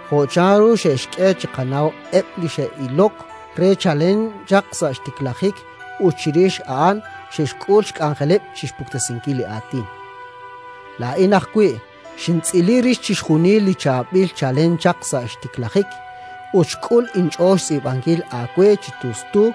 jo' chanru xe'xk'e chiqanaw eb' li xe'ilok re chalen chaq sa' xtiklajik ut chirix a'an xe'xk'ul xk'anjeleb' chi xpuktesinkil li Aatin. Laa'in ajwi' xintz'ili rix chixjunil chi chaab'il chalen chaq sa' xtiklajik, ut xk'ul inch'ool xtz'iib'ankil aawe chi tustu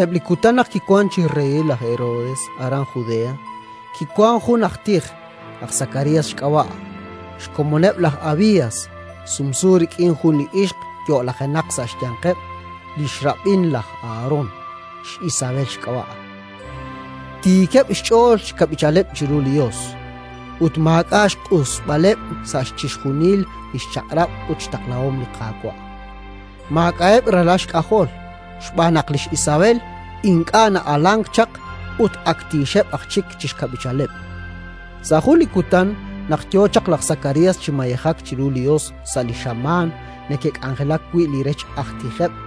Sa'eb' li kutan naq kiwank chi reyil laj Herodes aran Judea, kiwank jun aj tij, aj Sakarías xk'ab'a', xkomoneb' laj Abías, sumsu rik'in jun li ixq yo'lajenaq sa' xyanqeb' li xrab'in laj Aharón, x'Isabel xk'ab'a'. Tiikeb' xch'ool chi xkab'ichaleb' chiru li Yos, ut maak'a' xq'usb'aleb' sa' chixjunil li xchaq'rab' ut xtaqlahom li Qaawa'. Maak'a'eb' ralal xk'ajol, xb'aan naq lix Isabel ink'a' na'alank chaq ut ak tiixeb' aj chik chi xkab'ichaleb'. Sa' jun li kutan, naq yo chaq laj Sakarías chi mayejak chiru li Yos sa' li xamaan neke'k'anjelak wi' li rech aj tijeb',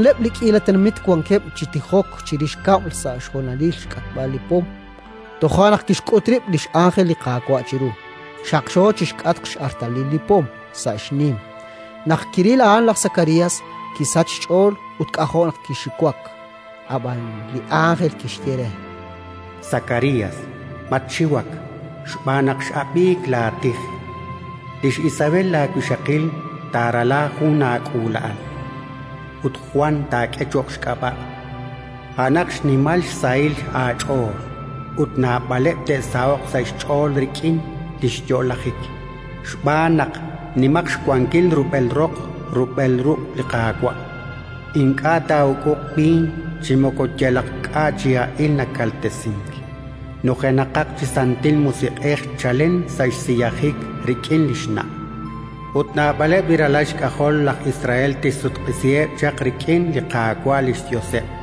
Chixjunileb' li k'iila tenamit wankeb' chi tijok chirix kab'l sa' xhonalil xk'atb'al li pom. Toja' naq kixk'ut rib' li x'ánjel li Qaawa' chiru, xaqxo chi xk'atq x'artalil li pom, sa' xnim. Naq kiril a'an laj Sakarías, kisachk xch'ool ut k'ajo' naq kixiwak. Ab'an li ánjel kixye re: —Sakarías, matxiwak xb'aan naq x'ab'imank laatij. Lix Isabel laawixaqil taarala jun aak'uula'a,l ut Jwan taak'e cho'q xk'ab'a'. A'anaq xnimal xsahil aach'ool, ut naab'aleb' te'saho'q sa' xch'ool rik'in li xyo'lajik, xb'aan naq nimaq xwankil rub'el roq rub'el ruq' li Qaawa'. Ink'a' taa'uk'uq b'iin chi moko yalaq k'a' chi ha'il nakaltesink. Nujenaqaq chi Santil Musiq'ej chalen sa' xsiyajik rik'in li xna', ut naab'aleb' li ralal xk'ajol laj Israel tixsutq'isiheb' chaq rik'in li Qaawa' li xYoseb'.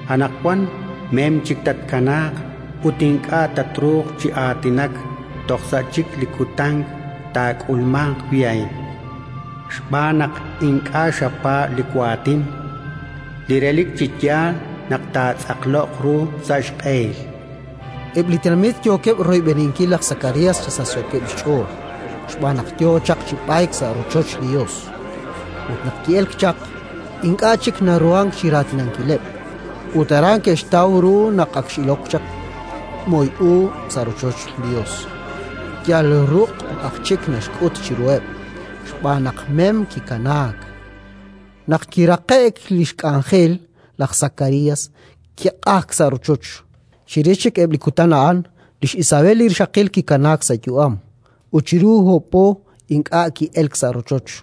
Anaqwan mem chik tatkanaaq ut ink'a' tatruhanq chi aatinak toj sa' chik li kutan taak'ulmanq wi' a'in, xb'aan naq ink'a' xapaab' li waatin, li relik chi yaal naq taatz'aqloq ru sa' xq'ehil. Eb' li tenamit yookeb' royb'eninkil laj Sakarías chi sachsookeb' xch'ool xb'aan naq yo chaq chi b'ayk sa' rochoch li Yos. Ut naq ki'elk chaq, ink'a' chik naruhank chi raatinankileb', ut aran ke'xtaw ru naq x'ilok chaq moy u sa' rochoch li Yos; yal ruq' aj chik naxk'ut chiruheb', xb'aan naq mem kikanaak. Naq kiraqe'k li xk'anjel, laj Sakarías kiq'ajk sa' rochoch. Chirix chik eb' li kutan a'an, lix Isabel li rixaqil kikanaak sa' yu'am, ut chiru oob' po ink'a' ki'elk sa' rochoch,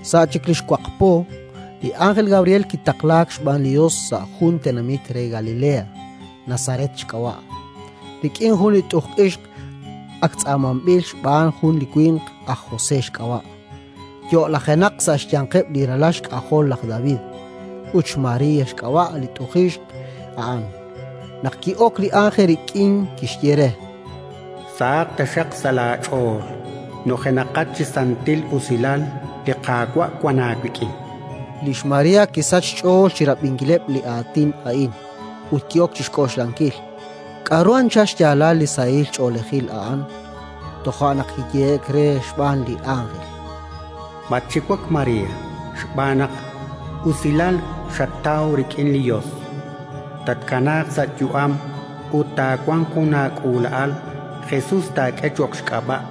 Sa' chik li xwaq po, li ánjel Gabriel kitaqlaak xb'aan li Yos sa' jun tenamit re Galilea, Nazaret xk'ab'a', rik'in jun li tuq'ixq ak tz'aamanb'il xb'aan jun li winq, aj José xk'ab'a', yo'lajenaq sa' xyanqeb' li ralal xk'ajol laj David; ut xMaría xk'ab'a' li tuq'ixq a'an. Naq ki'ok li ánjel rik'in, kixye re: —Sahaq taxaq sa' laach'ool, nujenaqat chi santil usilal! Li Qaawa' wank aawik'in. Lix María kisachk xch'ool chi rab'inkileb' li aatin a'in, ut ki'ok chi xk'oxlankil k'aru anchal xyaalal li sahil ch'oolejil a'an. Toja' naq kiyehe'k re xb'aan li ánjel: —Matxiwak, María, xb'aan naq usilal xataw rik'in li Yos. Tatkanaaq sa' yu'am ut taawanq jun aak'uula'al, Jesus taak'e cho'q xk'ab'a'.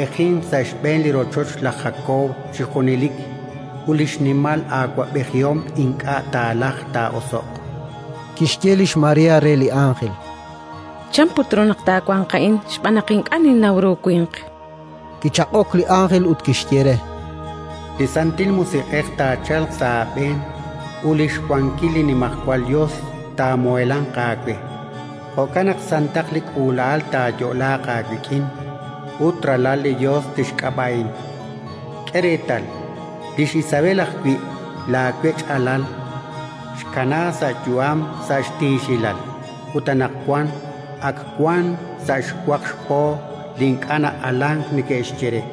Taa'awab'ejinq sa' xb'een li rochoch laj Jakob chi junelik, ut li xnimal awab'ejihom ink'a' taalajq taa'oso'q. Kixye lix María re li ánjel: —Chan put ru naq taawanq a'in, xb'aan naq ink'a' ninnaw ru winq? Kichaq'ok li ánjel ut kixye re: —Li Santil Musiq'ej taachalq sa' aab'een ut li xwankil li Nimajwal Yos taamuheelanq aawe. Jo'kan naq santaq li k'uula'al taayo'laaq aawik'in, ut Ralal li Yos tixk'ab'a'in. K'e reetal, lix Isabel ajwi', laawech'alal, xkanaak sa' yu'am sa' xtiixilal, ut anaqwan ak wank sa' xwaq xpo li ink'a' na'alank neke'xye re,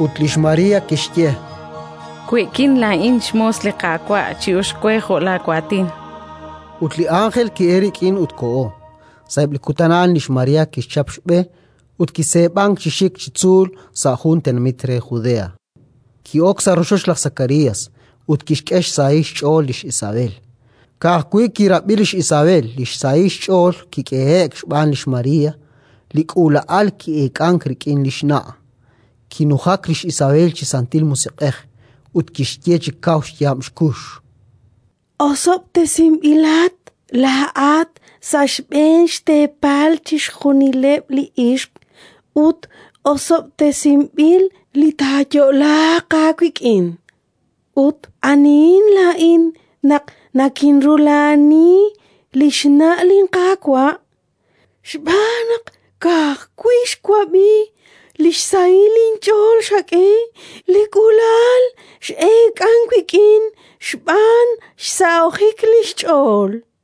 Ut lix María kixye: —We'kin laa'in xmoos li Qaawa'; chi'uxq we jo' laawaatin. Ut li ánjel ki'elk rik'in ut koho. Sa'eb' li kutan a'an lix María kixchap xb'e ut kiseeb'ank chi xik chi tzuul sa' jun tenamit re Judea. Ki'ok sa' rochoch laj Sakarías, ut kixk'e xsahil xch'ool lix Isabel. Ka'ajwi' kirab'i lix Isabel li xsahil xch'ool kik'ehe'k xb'aan lix María, li k'uula'al ki'eek'ank rik'in li xna'. Kinujak lix Isabel chi Santil Musiq'ej ut kixye chi kaw xyaab' xkux: —Osob'tesinb'ilat laa'at sa' xb'een xteepal chixjunileb' li ixq ut osob'tesinb'il li taayo'laaq aawik'in! Ut anihin laa'in naq nakinrula'ani li xna' linQaawa'? Xb'aan naq, ka'ajwi' xwab'i li xsahil inch'ool xak'e, li k'uula'al x'eek'ank wik'in xb'aan xsahojik li xch'ool.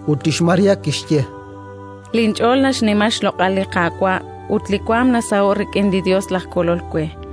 Ut lix María kixye: “Linch'ool naxnima xloq'al li Qaawa' ut li waanm nasaho'k rik'in li Yos laj Kolol we,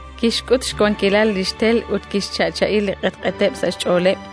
Kixk'ut xwankilal li xtel ut kixcha'cha'i li q'etq'eteb' sa' xch'ooleb'.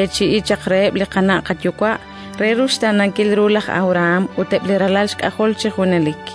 jo' kixyeechi'i chaq reheb' li qana' qayuwa': re ruxtaanankil ru laj Abrahán ut eb' li ralal xk'ajol chi junelik”.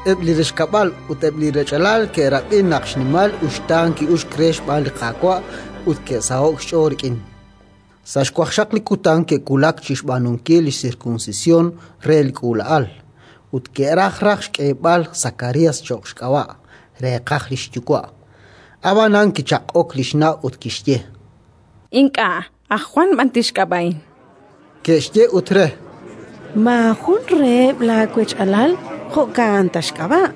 Eb' li rechkab'al ut eb' li rech'alal ke'rab'i naq xnimal uxtaan ki'uxk re xb'aan li Qaawa' ut ke'saho'k xch'ool rik'in. Sa' xwaqxaq li kutan ke'wulak chi xb'aanunkil li sirkunsisyon re li k'uula'al, ut ke'raj raj xk'eeb'al Sakarías cho'q xk'ab'a', reeqaj li xyuwa'. Ab'anan kichaq'ok li xna' ut kixye: —Ink'a'. Aj Jwan b'an tixk'ab'a'in. Ke'xye ut re: —Maajun reheb' laawech'alal jo' a'an ta xk'ab'a'.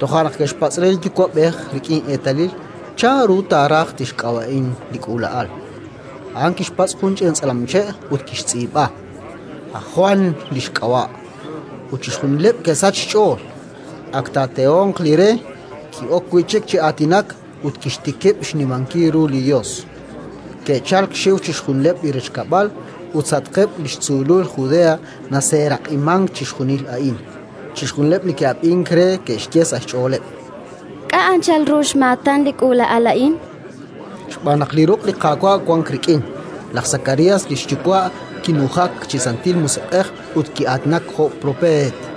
Toja' naq ke'xpatz' re li yuwa'b'ej rik'in eetalil chanru taaraj tixk'ab'a'in li k'uula'al. A'an kixpatz' jun ch'ina tz'alamche' ut kixtz'iib'a: “Aj Jwan li xk'ab'a'”. Ut chixjunileb' ke'sachk xch'ool. Ak taatehonq li re, ki'ok wi' chik chi aatinak ut kixtikib' xnimankil ru li Yos. Ke'chalk xxiw chixjunileb' li rechkab'al, ut sa'atqeb' li xtzuulul Judea naseeraq'imank chixjunil a'in. Chixjunileb' li ke'ab'ink re ke'xye sa' xch'ooleb': “K'a' anchal ru xmaatan li k'uula'al a'in?”. Xb'aan naq li ruq' li Qaawa' wank rik'in. Laj Sakarías li xyuwa' kinujak chi Santil Musiq'ej ut ki'aatinak jo' propeet: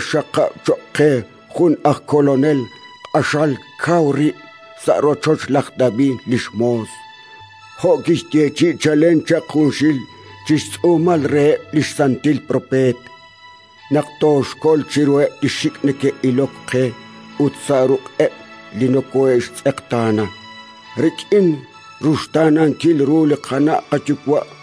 ut kixxaqab' cho'q qe jun aj Kolonel q'axal kaw rib', sa' rochoch laj David li xmoos, jo' kixyeechi'i chalen chaq junxil chi xtz'uumal reheb' li xsantil propeet: naq toxkol chiruheb' li xik' neke'ilok qe ut sa' ruq'eb' li nokoohe'xtz'eqtaana, rik'in ruxtaanankil ru li qana' qayuwa'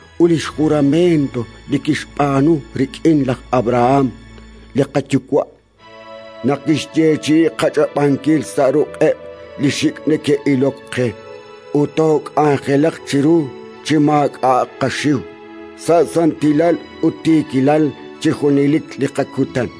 ut li jurament li kixb'aanu rik'in laj Abrahán li qayuwa', naq kixyeechi'i qach'ab'ankil sa' ruq'eb' li xik' neke'ilok qe ut took'anjelaq chiru chi maak'a'aq qaxiw, sa' santilal ut tiikilal chi junelik li qakutan.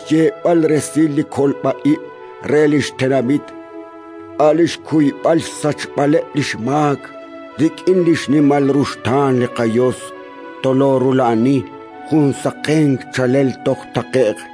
chi xyeeb'al resil li kolb'a ib' re li xtenamit, a' li xkuyb'al xsachb'aleb' li xmaak. Rik'in xnimal ruxtaan li qaYos toloorula'ani jun saqenk chaalel toj taqe'q,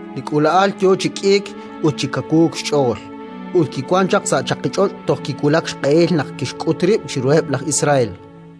Li k'uula'al yo chi k'iik ut chi kawuuk xch'ool; ut kiwank chaq sa' chaqich'och' toj kiwulak xq'ehil naq kixk'ut rib' chiruheb' laj Israel.